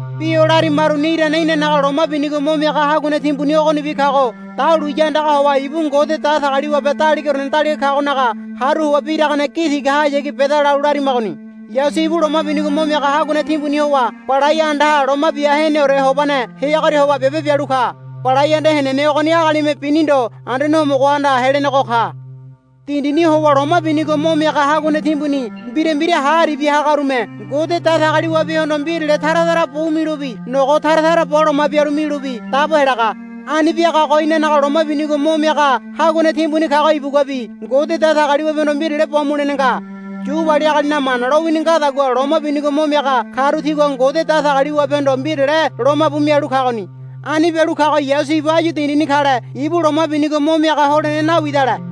Bi o larimaruni irane inanaga Loma Binigo Mo Miaga Haguane Timbuni ogonibi kago dahuliya andaga howa ibu Ngode Datagaliwabe Daligaorene Daliga kagonaga haru howa biragane gi tigahayagi beda lalu larimagoni. Yasu ibu Loma Binigo Mo Miaga Haguane Timbuni howa Balai Andaha Loma Bia Heneore Hobane heagoria howa biabe bialu ka. Balai anda henene ogoni agalime bini ndo Anduane Homogohanda helenego ka. Dindini howa loma binigo mo miaga haguane timbuni mbira mbira ha aribia hagarume Ngode Datagaliwabehondo mbirale tara tara bu milobi nogo tara tara bo loma bialu milobi dabo helaga. Ani biagago inanaga Loma Binigo Mo Miaga Haguane Timbuni kago ibuguabi Ngode Datagaliwabehondo mbirale bo mulene nga. Yu wali agalinaga Mana lowini ngadagua loma binigo mo miaga karu tigua Ngode Datagaliwabehondo mbirale lomabu mialu kagoni. Ani bialu kago Yasu ibu áyu dindini kale ibu loma binigo mo miaga holene nawidale.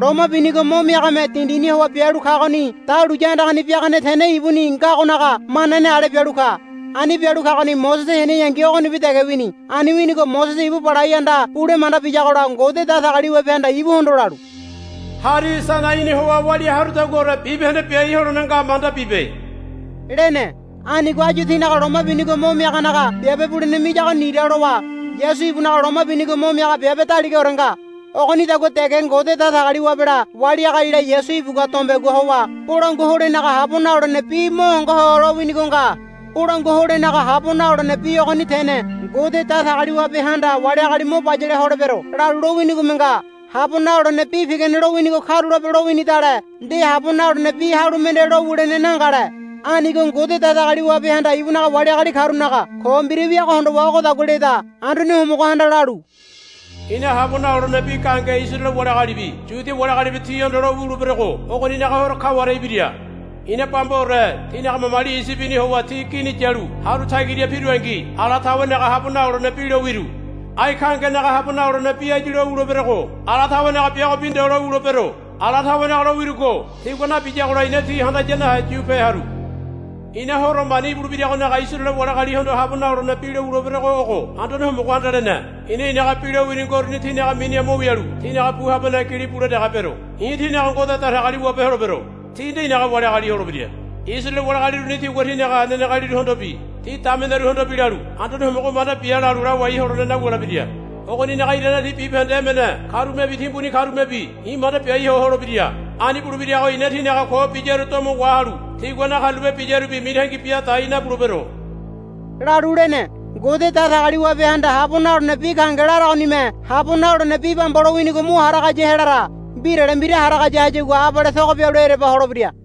Loma binigo mo miagame dindini howa bialu kagoni dahuliya andagani biagane tene ibuni ngagonaga manane ale bialu ka. Ani bialu kagoni Mosese heneyangi ogonibi dege wini. Ani winigo Mosese ibu Balai Anda bule manda biyagola Ngode Datagaliwabehanda ibuhondo lalu, Hari Sainaini howa walia harudaguaore bibahende biai holene nga manda bibe, lene. Anigo áyu tinaga loma binigo mo miaganaga biabe bulene miyago nira lowa Yasu ibunaga loma binigo mo miaga biabe daligaore nga. Ogonidagua dege Ngode Datagaliwabela wali agalila Yasu ibugua dombegua howa bolangua holenaga habo nalolene bi mo hongo ho lowinigo nga. Bolangua holenaga habo nalolene bi ogoni tene Ngode Datagaliwabehanda, Wali agali mo bayale holebero, lalu lowinigome nga. Habo nalolene bi pigane lowinigo karulape lowinidale nde habo nalolene bi halu mende lowulene nangale. Anigo Ngode Datagaliwabehanda ibunaga wali agali karunaga ko mbira wiago hondowa ogodagua leda, Anduane Homogohanda lalu, I̱na habo nalolene bi gahenge Isaraele wali agalibi Yuda wali agalibi tihondo lo wuleberogo ogonaga horo kaware ibira. I̱na bambaore tinaga mamali Iyibini howa ti gini yalu haru tagira pirungi ala tawenaga habo nalolene bi lo wiru. Ai gahengenaga habo nalolene bi áyu lo wuleberogo ala tawenaga biagobi ndo lowulebero. Ala tawenaga lowirugo tigua nabiyagola i̱na ti handaya nahe yu pe haru. I̱na horo mani ibulebiragonaga Isaraele wali agalihondo habo nalolene bi lo wuleberogo ogo, Anduane Homogohanda lene. I̱na i̱naga bi lowini ngoruni tinaga miniha mo wialu tinaga bu habaneha gili bule dege bero. I̱ tinaga Ngode Datagaliwabe holebero. Ti nde i̱naga wali agali holebira. Isaraele wali agali uruni tigua tinaga nenegealiruhondobi ti dameneruhondobi lalu, Anduane Homogo manda bia, lalu lawai holene nawulebira. Ogoninaga irane ti bibahende emene karumebi timbuni karumebi i̱ manda biai ho holebira. Ani bulebirago i̱na tinaga ko biyaru domo wahalu tigua nakarulape biyarubi mitangi bia dai nabulebero, lalu lene. Ngode Datagaliwabehanda habo nalolene bi gahenge laragonime habo nalolene bi bamba lowinigo mo haragaya helara. Mbirale mbira haragaya hayagua abale togo bialu ereba holebira.